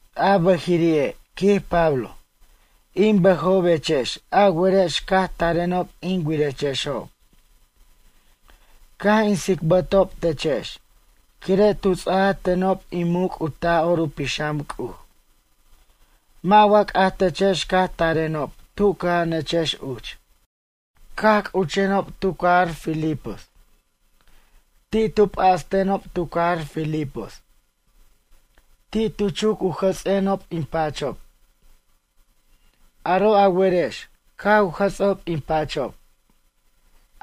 A bʌjiri'e', quij Pablo, in bʌjobechex a werex caj tarenob in wirechexob. Caj in tsicbʌtob techex quire' tu ts'aj tenob in muc' u Taj'or u Pixam C'uj. Mʌ' wa c'ajtechex caj tarenob tu cʌja'anechex uch, caj c'uchenob tu cajar Filipos. Ti' tu p'astenob tu cajar Filipos. Ti' tu chuc u jʌts'enob in pachob. Aro' a werex caj u jʌts'ob in pachob.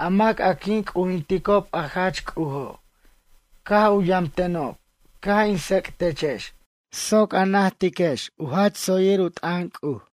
A mac a quin c'ujinticob a jach C'ujo', caj u yamtenob caj in tsec'techex soc a najtiquex a jach tsoyir u t'ʌn C'uj.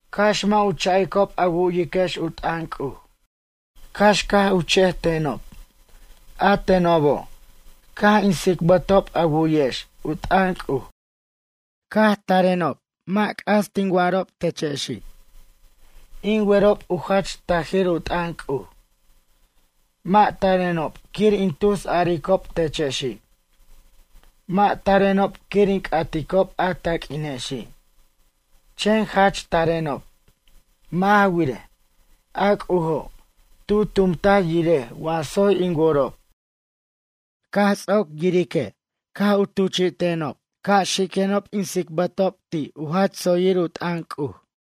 Cax mʌ' u cha'icob a wu'yiquex u t'ʌn C'uj, cax caj u chejtenob, a tenobo' caj in tsicbatob a wu'yex u t'ʌn C'uj. Caj tarenob mʌ' c'as tin wa'arob techexi'. In werob u jach tajir u t'ʌn C'uj. Mʌ' tarenob quir in tus aricob techexi'. Mʌ' tarenob quir in c'aticob a taq'uinexi'. Chen jach tarenob, mʌ' ja wirej, a C'ujo' tu tumtaj yirej wa tsoy in worob. Caj ts'oc yirique' caj u tuchi'tenob ca' xiquenob in tsicbarob ti' u jach tsoyir u t'ʌn C'uj.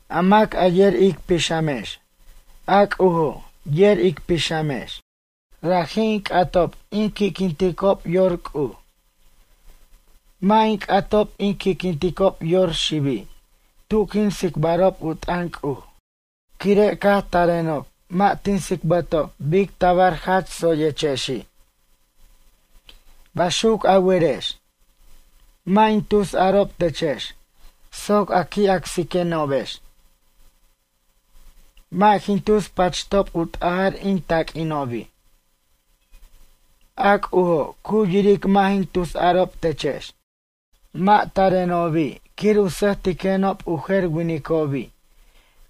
A mac a yer ic pixamex, a C'ujo' yer ic pixamex. Raji' in c'atob in qui'quinticob yor C'uj. Mʌ' in c'atob in qui'quinticob yor xibi' tu quin tsicbarob u t'ʌn C'uj. Quire' caj tarenob mʌ' tin tsicbʌtob bic tabar jach tsoyechexi'. Baxuc a werex. Mʌ' in tusarob techex soc a qui' acsiquenobex. Mʌ' jin tus pachtob u t'ajʌr in taq'uinobi'. A C'ujo' cu yiric mʌ' jin tusarob techex. Mʌ' tarenobi' quir u sʌjtiquenob u jer winicobi'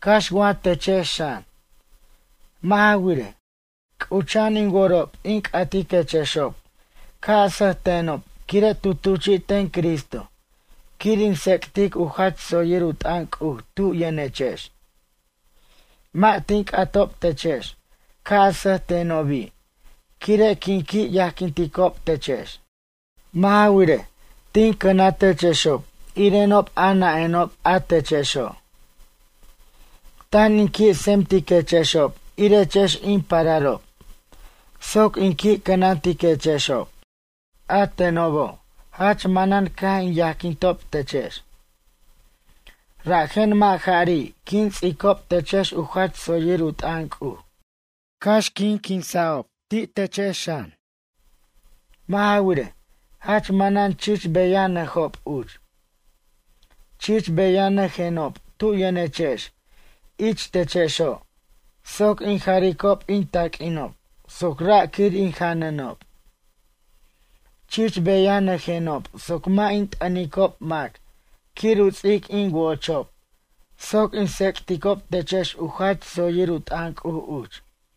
cax wa techex xan. Mʌ' ja wirej, c'ucha'an in worob in c'atiquechexob ca' a sʌjtenob quire' tu tuchi'ten ten Cristo quir in tsec'tic u jach tsoyir u t'ʌn C'uj tu yʌnechex. Mʌ' tin c'atob techex ca' a sʌjtenobi' quire' quin qui' yajquinticob techex. Mʌ' ja wirej, tin cʌnatechexob irenob a nʌ'enob a techexo'. Tan in qui' tsemtiquechexob irechex in pararob soc in qui' cʌnantiquexob. A tenobo' jach manʌn caj in yajquintob techex. Rajen mʌ' jari' quin ts'icob techex u jach tsoyir u t'ʌn C'uj, cax quin quinsa'ob ti' techex xan. Mʌ' ja wirej, jach manan chich beyajenob uch? Chich beyanʌjenob tu yʌnechex ich techexo' soc in jaricob in taq'uinob soc ra' quir in janʌnob. Chich beyanʌjenob soc mʌ' in t'ʌnicob mac quir u ts'ic in wo'ochob soc in tsec'ticob techex u jach tsoyir u t'ʌn C'uj uch.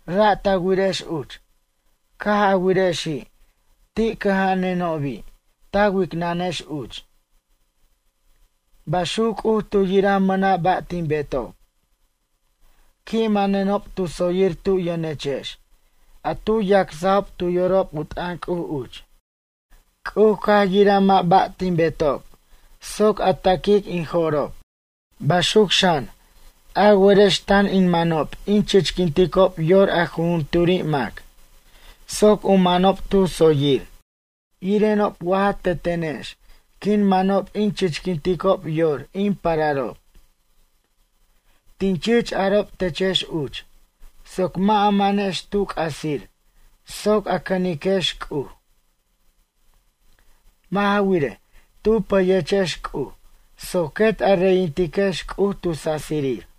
Ra' ta wirex uch. Caj a wirexi' ti' cʌja'anenobi' ta wicnʌnex uch. Baxuc C'uj tu yiraj mʌna' ba' tin betob. Qui' manenob tu tsoyir tu yʌnechex a tu yacsajob tu yorob u t'ʌn C'uj uch. C'uj caj yiraj mʌ' ba' tin betob soc a ta'quic in jo'rob. Baxuc xan, a werex tan in manob in chichquinticob yor a jujunturi' mac soc u manob tu tsoyir, irenob wa ja tetenex quin manob in chichquinticob yor in pararob. Tin chich arob techex uch, soc mʌ' a manex tu c'asir soc a cʌniquex C'uj. Mʌ' ja wirej, tu pʌyechex C'uj soc quet a reyintiquex C'uj tu sasirir.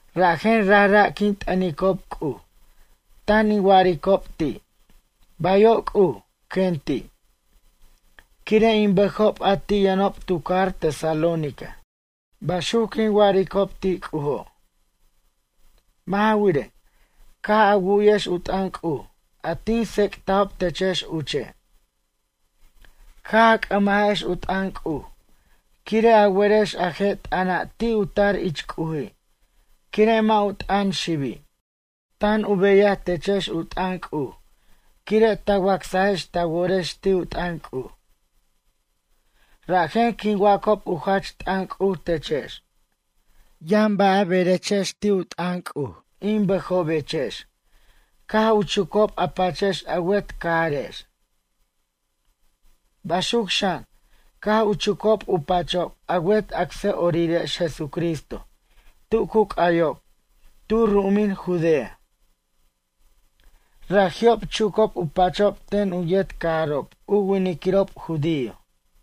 Rajen rajra' quin t'ʌnicob C'uj tan in wa'aricob ti': “Bayo' C'uj”, quen ti', quire' in bʌjob a ti' yʌnob tu cajar Tesalónica. Baxuc quin wa'aricob ti' C'ujo'. Mʌ' ja wirej, caj a wu'yex u t'ʌn C'uj a tin tsec'tajob techex uche'. Caj a c'ʌmajex u t'ʌn C'uj quire' a werex a je' t'ʌna' ti' u tar ich C'uji' quire' mʌ' u t'ʌn xibi'. Tan u beyaj techex u t'ʌn C'uj quire' ta wacsajex ta worex ti' u t'ʌn C'uj. Rajen quin wacob u jach t'ʌn C'uj techex. Yʌn ba' a berechex ti' u t'ʌn C'uj in bʌjobechex caj u chucob a pachex a wet cajarex. Baxuc xan, caj u chucob u pachob a wet acsʌ'orirex Jesucristo tu cu c'ayob tu ru'umin Judea. Raji'ob chucob u pachob ten u yet cajarob u winiquirob judío.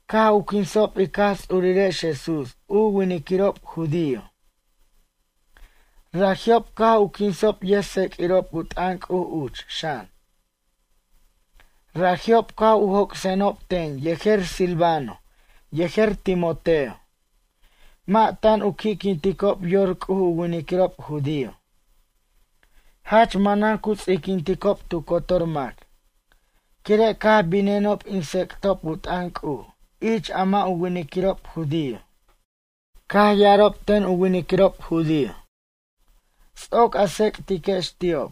Caj u quinsob ic Jaj Ts'urirex Jesús u winiquirob judío. Raji'ob caj u quinsob yʌjtsec'irob u t'ʌn C'uj uch xʌn. Raji'ob caj u joc'senob ten yejer Silvano yejer Timoteo. Mʌ' tan u qui'quinticob yor C'uj u winiquirob judío. Jach manan cu ts'iquinticob tu cotor mac. Quire' caj binenob in tsec'tob u t'ʌn C'uj ich mʌ' u winiquirob judío. Caj ya'arob ten u winiquirob judío: “Ts'oc a tsec'tiquex ti'ob,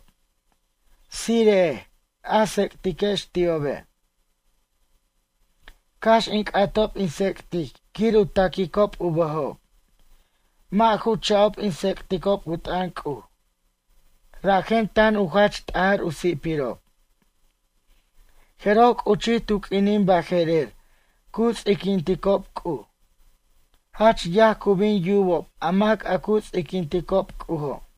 tsire'ej a tsec'tiquex ti'obe'”, cax in c'atob in tsec'tic quir u ta'quicob u bʌjob. Mʌ' ju cha'ob in tsec'tob u t'ʌn C'uj. Rajen tan u jach t'ajar u si'pirob. Jeroj c'uchij tu q'uinin baje'rer cu ts'iquinticob C'uj. Jach yaj cu bin yubob a mac a cu ts'iquinticob C'ujo'.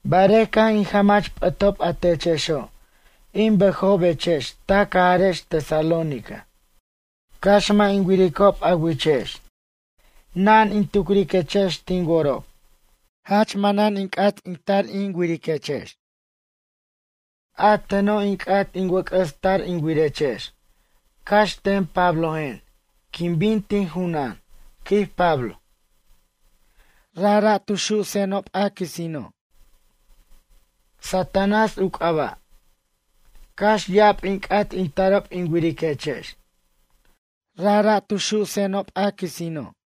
Barej caj in jamach p'ʌtob a techexo', in bʌjobechex ta cajarex Tesalónica. Cax mʌ' in wiricob a wichex na'an in tucriquechex tin worob. Jach manan in c'at in tar in wiriquechex. A teno' in c'at in wʌc'ʌs tar in wirechex cax ten Pablojen quin bin tin junan, quij Pablo. Rajra' tu su'senob a quisino'. Satanás u c'aba'. Cax ya'ab in c'at in tarob in wiriquechex. Rajra' tu su'senob a quisino'.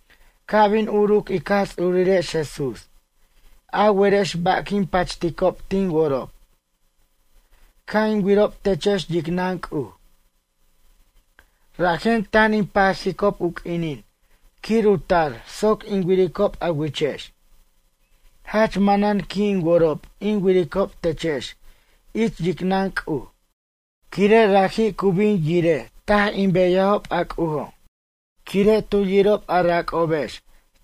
Ca' bin uruc ic Jaj Ts'urirex Jesús, a werex ba' quin pachticob tin worob? Ca' in wirob techex yicnʌn C'uj. Rajen tan in pajicob u q'uinin quir u tar soc in wiricob a wichex. Jach manan qui' in worob in wiricob techex ich yicnʌn C'uj. Quire' raji' cu bin yiraj taj in beyajob a C'ujo'. Quire' tu yirob a rac'obex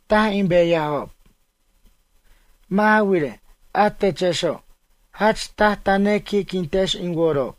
taj in beyajob. Mʌ' ja wirej, a techexo', jach taj ta nequi'quintex in worob.